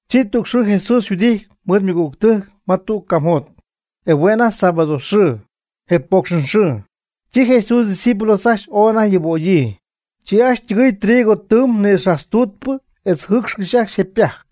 Chi tüg xɨɨ Jesús yhuɨdity mɨɨd ymɨgügtɨjc ma tüg camjot. E hue' anajty sábado xɨɨ, je poocxɨn xɨɨ. Chi Jesús ydiscípulos ajcxy oy anajty yubögyii. Chi ajcxy ytɨgɨɨy trigo tɨɨm nïxajtztutp etz yjɨɨcxy ajcxy je ypajc.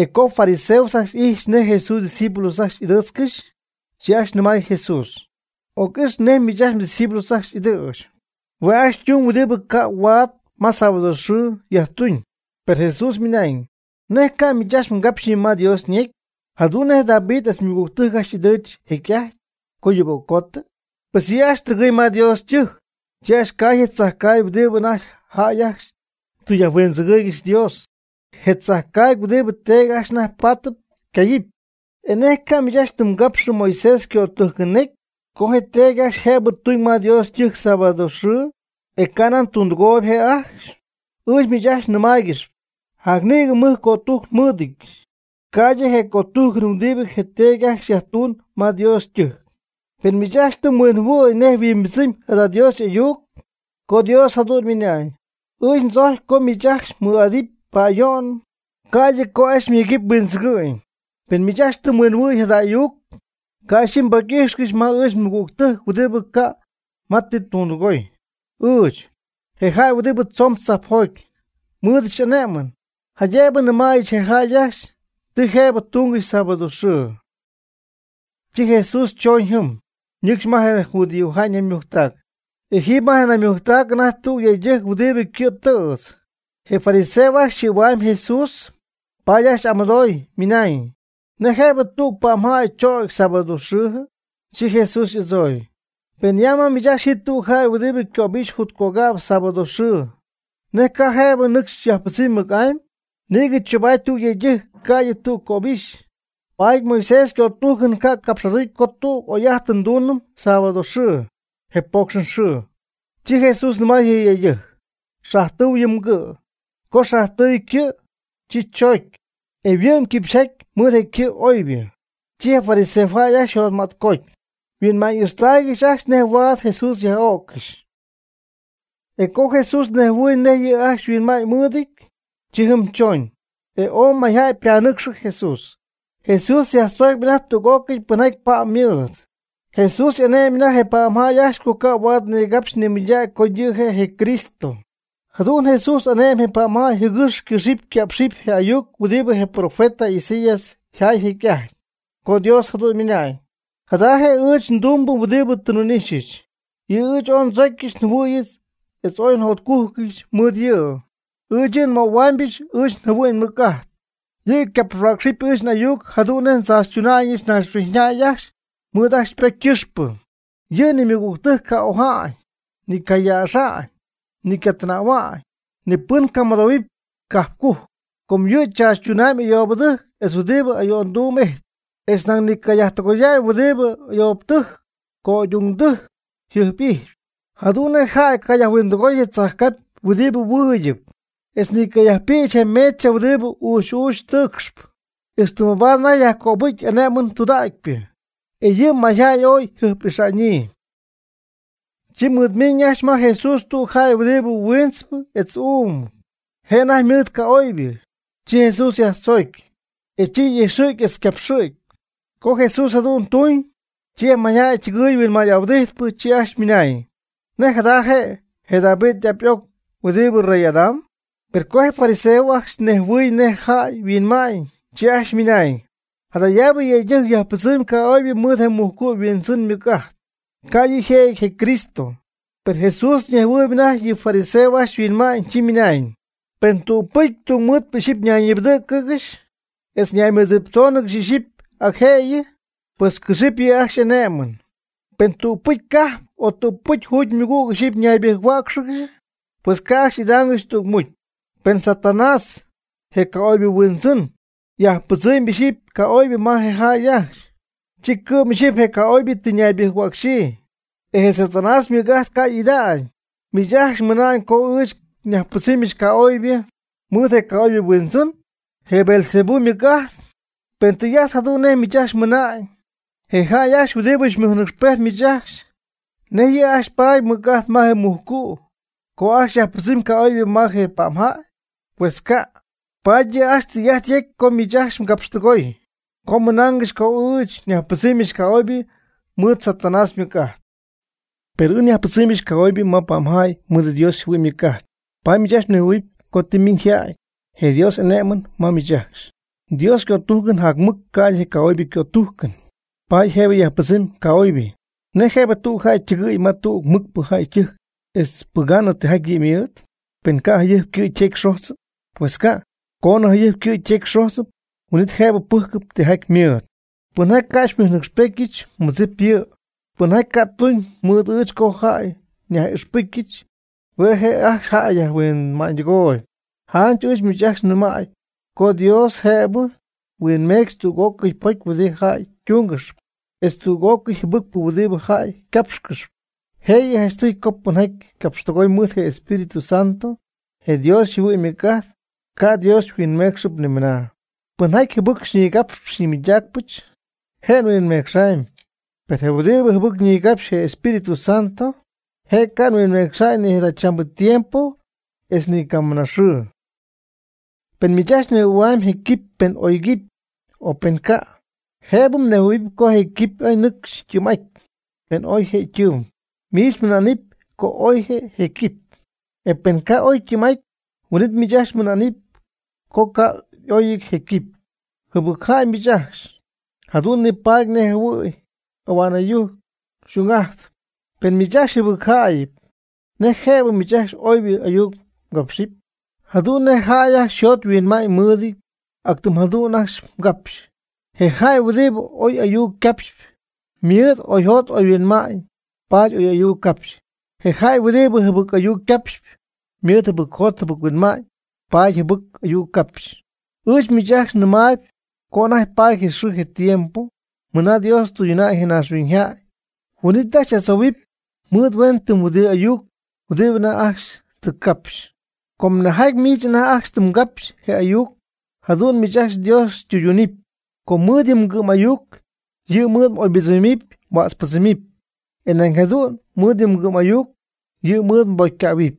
E co je fariseos ajcxy ijxy nej Jesús ydiscípulos ajcxy y'ɨdɨɨtzcɨxy, chi ajcxy nɨmay Jesús: ―Oc'ix nej miich mdiscípulos ajcxy y'ɨdɨ̈ch. Hue' ajcxy tumyb huɨdibɨ ca' huaad ma sábado xɨɨ yajtuñ. Per Jesús mɨnañ: ―¿Nej ca' miich ajcxy mgapxyñɨ ma Dios ñecy, jadu'n nej David etz ymɨgügtɨjc ajcxy ɨdɨ̈ch jecy'ajty co yuböccotɨ? Pues yɨ' ajcxy tɨgɨɨy ma Dios ytɨjc. Chi cay ajcxy je tzajcaagy huɨdibɨ anajty jäy ajcxy tɨ yajhuindzɨgɨ̈y Dios. Je' je tzajcaagy huɨdibɨ teedy ajcxy anajty paatɨp cayɨpy. ¿Nej ca' miich ajcxy tɨ mgapxyñɨ Moisés ycötujcɨn necy co je teedy ajcxy jëbɨ ytuñ ma Dios ytɨjc sábado xɨɨ, e ca' nan tundɨgooyb je' ajcxy? Ɨɨch miich ajcxy nɨmaaygɨxyp, jac nïgɨ mɨj cötújcɨn nmɨ́ɨdɨdyɨch, ca'ydɨ je cötujcɨn huɨdibɨ je teedy ajcxy yajtuñ ma Dios ytɨjc. Pen miich ajcxy tɨ mhuinjɨhuɨ̈y nej yhuimbɨdzɨmy jada Dios y'ayuc, co Dios jadu'n ymɨnañ: “Ɨɨch ndzojcpy co miich ajcxy mɨɨd'idɨpy pa'ayo'n ca'ydɨ co ajcxy myegɨpy huindzɨgɨ'ñ.” Pen miich ajcxy tɨ mhuinjɨhuɨ̈y jada ayuc, ca' ixyipy mbocy'ixy ma ɨɨch nmɨgügtɨjc huɨdibɨ ca' ma tɨ ytundɨgooy. Ɨɨch, je jäy huɨdibɨ tzoon tzajpjoty, nmɨɨdɨch ane'mɨn, jaydëbɨ nɨmäyɨch je jäy ajcxy ti jëbɨ tungɨxy sábado xɨɨ. Chi Jesús choñ jɨm, ñɨcxy ma je judíojäy ñaymujctac. E jiiby ma je naymujctac anajty tüg yëydɨjc huɨdibɨ ycɨ̈tɨ̈tz. Je fariseo ajcxy xɨ̈huamyb Jesús, paady ajcxy y'amɨdooy, ymɨnañ: ―¿Nej jëbɨ tüg pa'mjäy chögy sábado xɨɨjɨ? Chi Jesús y'adzooy: ―Pen ya ma miich ajcxy ji tüg jäy huɨdibɨ cöbixy yjutcögäy sábado xɨɨ, ¿nej ca' je' nɨcxy yajpɨdzɨmy mɨc'amy? Nïgɨ tzobaatp tüg yëydɨjc ca'ydɨ tüg cöbixy, paady Moisés ycötujcɨn ca' capx'aducy co tüg oy'ajtɨn nduunɨm sábado xɨɨ, je poocxɨn xɨɨ. Chi Jesús nɨmay je yëydɨjc: ―Xajtɨu yɨ mgɨ'. Co xajtɨɨy ycɨ', chi choocy, e huɨ'my quipxyjaty mɨɨd je ycɨ' oybɨ. Chi je fariseos ajcxy yjotmätcoty, yhuinma'ñ ixtaaygɨxy ajcxy nej huaad Jesús ocyaj'o'ccɨxy. E co Jesús nejhuɨɨy nej yɨ' ajcxy yhuinma'ñ mɨɨdɨty, chi jɨm choñ. E ooy mayjäy ypanɨcxɨ Jesús, Jesús yajtzoocpy anajty tüg'ócɨy pɨnjaty pa'm mɨɨd. Jesús ane'my je pa'mjäy ajcxy co ca' huaad nigapxy nimɨydägy co yɨ' je' je Cristo. Jadu'n Jesús ane'my je pa'mjäy jɨgɨx ycɨxɨpy ycá'pxɨpy je ayuc huɨdibɨ je profeta Isaías yjaay jecy'ajty, co Dios jadu'n ymɨnañ: Jada je' ɨɨch ndumbɨ huɨdɨ tɨ nhuin'ixyɨch. Yɨ' ɨɨch ooy ndzocyɨch njɨhuɨ̈yɨch etz ooy njotcujcɨch mɨɨd yɨ'. Ɨɨch yɨ' nmöhuamybɨch ɨɨch njɨhuɨ'ñ mɨc'ajt. Yɨ' capxhuäcxɨp ɨɨch n'ayuc jadu'n nej ndzaachytuna'ñɨch naaxhuiñyjäy ajcxy mɨɨd ajcxy ypocy ycɨxpɨ. Yɨ' ni ymɨgügtɨjc ca' oja'ñ, ni ycayäxa'ñ, ni ycatɨnähua'ñ, ni pɨn ca' mɨdoohuɨpy ma cajp cujc. Ca' yɨ' tzaachytuna'ñ ayoobɨtɨjc etz huɨdibɨ ayo'ndumb ijtp. Etz nañ ni ca' yajtɨgoya'ñ huɨdibɨ ayoobɨtɨjc yco'ögy'ungdɨjc yjɨjp'ijxpy. Jadu'n nej jäy cayajhuindɨgoy tzajcapy huɨdi huiidyɨp etz ni cayajpïch je mecha huɨdibɨ uuxy uuxy tɨɨcxp. Ixtɨ mabaad anajty yajcopɨcy y'ane'mɨn tudägypɨ. E yɨ' mayjäy ooy yjɨjp'ixa'ñyii. Chi mɨɨd miiñ ajcxy ma Jesús tüg jäy huɨdibɨ huintzɨp etz uum. Je' anajty mɨɨd ca'oybɨ. Chi Jesús yajtzoogy, e chi y'ijxɨ̈gy etz ycapxɨ̈gy. Co Jesús jadu'n tuñ, chi je mayjäy ytɨgɨɨy huinmay'ahuɨdijt, chi ajcxy ymɨnañ: ―¿Nej jada je', je David y'ap y'oc huɨdibɨ rey'adam? Per co je fariseos ajcxy nejhuɨy nej je jäy huinmay, chi ajcxy ymɨnañ: ―Jadaabɨ yëydɨjc yajpɨdzɨmy ca'oybɨ mɨɨd je mujcu' huindzɨn ymɨc'ajt (ca' yɨ' yjëjɨty je Cristo). Per Jesús ñejhuɨɨyb anajty ti je fariseos ajcxy yhuinmaayb, chi ymɨnañ: ―Pen tügpɨcy tungmɨɨdpɨ ixyipy ñaybɨjc-huäcxɨgɨxy, etz ñaymɨdziptzóonɨgɨxy ixyipy ac jëyɨ, pues cɨxɨpy yɨ' ajcxy y'ane'mɨn. Pen tüg cajp o tügpɨcy jugymɨgüg ixyipy ñaybɨjc-huäcxɨgɨxy, pues ca' ajcxy y'idaangɨxy tügmucy. Pen Satanás, je ca'oybɨ huindzɨn, yajpɨdzɨmy ixyipy ca'oybɨ ma je jäy ajcxy, chi cɨ'm ixyipy je ca'oybɨ tɨ ñaybɨjc-huäcxɨgɨxy, e je Satanás ymɨc'ajt ca' y'ida'ñ. Miich ajcxy mɨnamb co ɨɨch nyajpɨdzɨmyɨch ca'oybɨ mɨɨd je ca'oybɨ huindzɨn, je Beelzebú ymɨc'ajt. Pen tɨy'ajt jadu'n nej miich ajcxy mɨna'ñ, je jäy ajcxy huɨdibɨ xymɨjnɨcxpejt miich ajcxy, ¿nej yɨ' ajcxy paady mɨc'ajt ma je mujcu' co ajcxy yajpɨdzɨmy ca'oybɨ ma je pa'm jäy? Pues ca', paady yɨ' ajcxy tɨy'ajt yejcp co miich ajcxy tɨ mgapxtɨgoy co ymɨnaangɨxy co ɨɨch nyajpɨdzɨmyɨch ca'oybɨ mɨɨd Satanás ymɨc'ajt. Per ɨɨch nyajpɨdzɨmyɨch ca'oybɨ ma pa'mjäy mɨɨd Dios yjɨhuɨ'ñ ymɨc'ajt. Paady miich ajcxy nejhuɨɨyb co tɨ ymiiñ yjäty je Dios y'ane'mɨn ma miich ajcxy. (Dios ycötujcɨn jac mɨc ca'ydɨ je ca'oybɨ ycötujcɨn, paady jëbɨ nyajpɨdzɨmyɨch ca'oybɨ.) ¿Nej jëbɨ tüg jäy ytɨgɨɨy ma tüg mɨcpɨ jäy ytɨjc etz pɨgaanɨ tijaty yɨ' ymɨɨd, pen ca' jayɨjp ycɨ' ytecy xojtzɨty? Pues ca'. Coonɨ jayɨjp ycɨ' ytecy xojtzɨty, huin'it jëb pɨjcɨp tɨjaty ymɨɨd. Pɨnjaty ca' xymɨjnɨcxpetyɨch, xymɨdzipɨch yɨ'. Pɨnjaty ca' tuñ mɨɨd ɨɨch co jäy nyaj'ixpɨcyɨch, hue' je' ajcxy jäy yajhuinma'ñydɨgooyb. Janch ɨɨch miich ajcxy nɨmäy co Dios jëbɨ huinmecxɨp tüg'ócɨy pocy huɨdibɨ jäy ytungɨxp etz tüg'ócɨy jɨbɨcpɨ huɨdibɨ jäy ycapxcɨxp. Jëyɨ janchtɨy co pɨnjaty capxtɨgooyb mɨɨd je Espíritu Santo, je Dios yjɨhuɨ'ñ ymɨc'ajt, ca' Dios huinmecxɨp nimɨna. Pɨnjaty jɨbɨc xyñigapxpɨch xyñimɨydacpɨch, je' huinmecxam. Per je huɨdibɨ jɨbɨc ñigapxpy je Espíritu Santo, je' ca' huinmecxa'ñ ni jadachambɨ tiempo, etz ni camɨna xɨɨ. Pen miich ajcxy mnejhuɨ̈huamy je quipy pen oy quipy, o pen ca', jëbɨ mnejhuɨ̈huɨpy co je quipy nɨcxy ytɨɨm'aty. Pen oy je ytɨɨm, miich mɨna'nɨp co oy je quipy. E pen ca' oy ytɨɨm'aty, huin'it miich ajcxy mɨna'nɨp co ca' y'oyɨty je quipy. Jɨbɨc jäy miich ajcxy, jadu'n nipaady nej jɨhuɨ̈y ahua'n ɨyujc xy'ung'ajtp. Pen miich ajcxy jɨbɨc jäy'ajtp, ¿nej jëbɨ miich ajcxy oybɨ ayuc mgapxɨpy? Jadu'n nej jäy ajcxy yjot yhuinma'ñ mɨɨdɨty, ac tɨm jadu'n ajcxy ycapxy. Je jäy huɨdibɨ oy ayuc ycapxpy, ymɨɨd oyjot oyhuinma'ñ paady oy ayuc capxy. Je jäy huɨdibɨ jɨbɨc ayuc capxp, ymɨɨd jɨbɨc jot jɨbɨc huinma'ñ, paady jɨbɨc ayuc capxy. Ɨɨch miich ajcxy nɨmay co anajty paady je xɨɨ je tiempo mɨna Dios tɨyduna'ñ je naaxhuiñyjäy, huin'it ajcxy y'adzohuɨpy mɨɨd huen tɨm huɨdibɨ ayuc huɨdibɨ anajty ajcxy tɨ mgapxy. Com nejjaty miich anajty ajcxy tɨ mgapxy je m'ayuc jadu'n miich ajcxy Dios xytɨydunɨp. Com mɨɨd yɨ mgɨ'm ayuc yɨ' mɨɨd m'oybɨdzɨmɨpy mhuätzpɨdzɨmɨpy. E nañ jadu'n mɨɨd yɨ mgɨ'm ayuc yɨ' mɨɨd mbocycähuɨpy.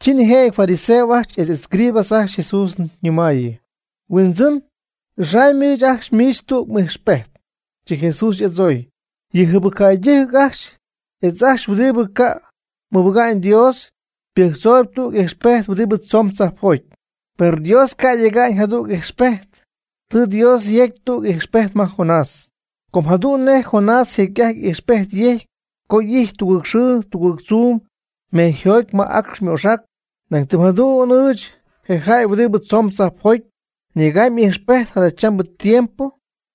Chi nijëjɨty fariseos ajcxy etz escribas ajcxy Jesús nɨmayɨ: ―Huindzɨn, n'ixamy ɨɨch ajcxy miich tüg m'ijxpejt. Chi Jesús y'adzooy: ―Yɨ jɨbɨc jäydɨjc ajcxy etz ajcxy huɨdibɨ ca' mɨbɨga'ñ Dios ypɨjctzooyb tüg ijxpejt huɨdibɨ tzomb tzajpjoty. Per Dios ca' yega'ñ jadüg ijxpejt. Tɨ Dios yecy tüg ijxpejt ma Jonás. Com jadu'n nej Jonás jecy'ajty ijxpejt yejcy co y'ijty tugɨɨg xɨɨ tugɨɨg tzuum mejyjoty ma acx ymoxac, nañ tɨm jadu'n ɨɨch, je jäy huɨdibɨ tzoon tzajpjoty, nyegamy ijxpejt jadachambɨ tiempo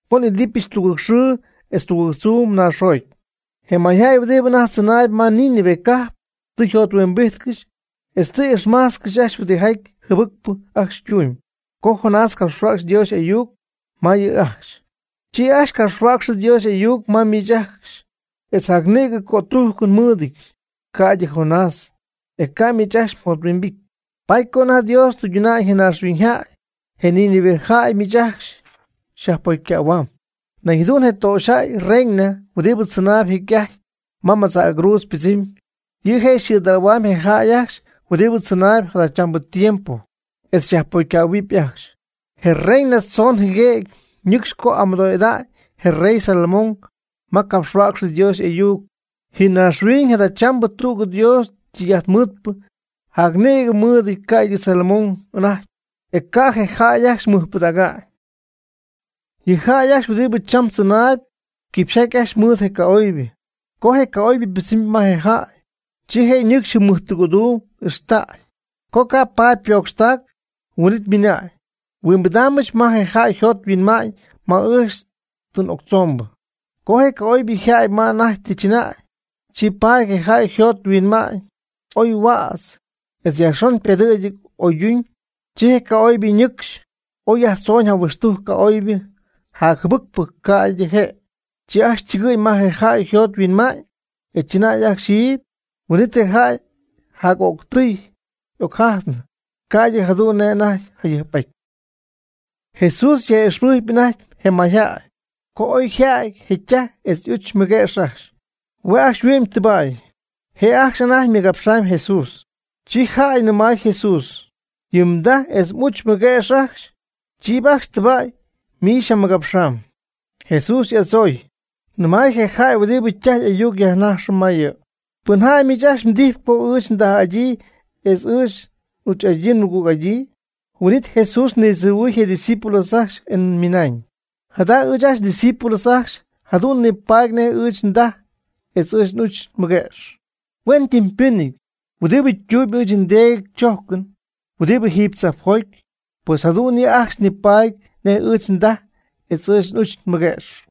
co n'idɨpyɨch tugɨɨg xɨɨm etz tugɨɨg tzuum naaxjoty. Je mayjäy huɨdibɨ anajty tzɨnaayb ma Nínive cajp, tɨ jothuimbijtcɨxy etz tɨ ixmach ajcxy huɨdijaty jɨbɨcpɨ ajcxy ytumyb co Jonás capxhuäcxy Dios y'ayuc ma yɨ' ajcxy. Cha ɨɨch ngapxhuäcxyɨch Dios y'ayuc ma miich ajcxy, etz jac nïgɨ cötujcɨn nmɨɨdɨdyɨch, ca'ydɨ Jonás; e ca' miich ajcxy mjothuimbity. Paady co anajty Dios tɨyduna'ñ je naaxhuiñyjäy, je Nínive jäy miich ajcxy xyajpocycähuam. Nañ jadu'n je töxyjäy reina huɨdibɨ tzɨnay jecy'ajty ma madza'cruudz ypɨdzɨmy, yɨ' je' xɨ̈dähuam je jäy ajcxy huɨdibɨ tzɨnaayb jadachambɨ tiempo, etz yajpocycähuɨɨb ajcxy. Je reina tzoon jɨguëgy nɨcxy co amɨdo'ida'ñ je rey Salomón ma capxhuäcxɨ Dios y'ayuc. Ji naaxhuiñ jadachambɨ tüg Dios ytɨy'ajtmɨɨdpɨ jac nïgɨ ymɨjɨty, ca'ydɨ Salomón anajty, e ca' je jäy ajcxy mɨjpɨdäga'ñ. Yɨ jäy ajcxy huɨdibɨ cham tzɨnaayb, quipxyjaty ajcxy mɨɨd je ca'oybɨ. Co je ca'oybɨ ypɨdzɨmy ma je jäy, chi je' ñɨcxy jɨm mɨjtɨgɨ̈duum y'ijxtacy. Co ca' paty ypocxtac, huin'it ymɨna'ñ: “Huimbidaambɨch ma je jäy yjot yhuinma'ñ ma ɨɨch tɨ n'octzombɨ.” Co je ca'oybɨ yjäty ma anajty tɨ chɨnäy, chi paty je jäy yjot yhuinma'ñ ooy yhuätzɨty etz yajxon ypedɨ̈gɨty oy oyduñ. Chi je ca'oybɨ ñɨcxy oy yajtzooñ jahuɨxtujc ca'oybɨ jac jɨbɨcpɨ ca'ydɨ je'. Chi ajcxy ytɨgɨɨy ma je jäy yjot yhuinma'ñ, e chɨnay ajcxy jiiby. Huin'it je jäy jac'öctɨy oy yjajtnɨ, ca'ydɨ jadu'n nej anajty jayɨjp'aty. Jesús yaj'ixpɨjcpy anajty je mayjäy, co oy yja'ty je' ytaj etz y'uch mɨguëx ajcxy. Hue' ajcxy yhuɨ'my tɨba'y. Je' ajcxy anajty ymɨgapxamy Jesús. Chi jäy yajnɨmay Jesús: ―Yɨ mdaj etz m'uch mɨguëx ajcxy, chiiby ajcxy tɨba'y, miich xyjamɨgapxamb. Jesús y'adzooy, nɨmay je jäy huɨdibɨ ytaj y'ayuc yajnajxɨ ma yɨ': ―¿Pɨn jäy miich ajcxy mdijy co ɨɨch ndaj'adyii etz ɨɨch n'uch'adyii nmɨgüg'adyii? Huin'it Jesús nitziihuɨɨy je' ydiscípulos ajcxy e ymɨnañ: ―Jada ɨɨch ndiscípulos ajcxy jadu'n nipaady nej ɨɨch ndaj etz ɨɨch n'uch nmɨguëx. Huen ytɨmpɨnɨty huɨdibɨ ytumyb ɨɨch nDeedy chojcɨn, huɨdibɨ jiiby tzajpjoty, pues jadu'n yɨ' ajcxy nipaady nej ɨɨch ndaj etz ɨɨch n'uch mɨguëx.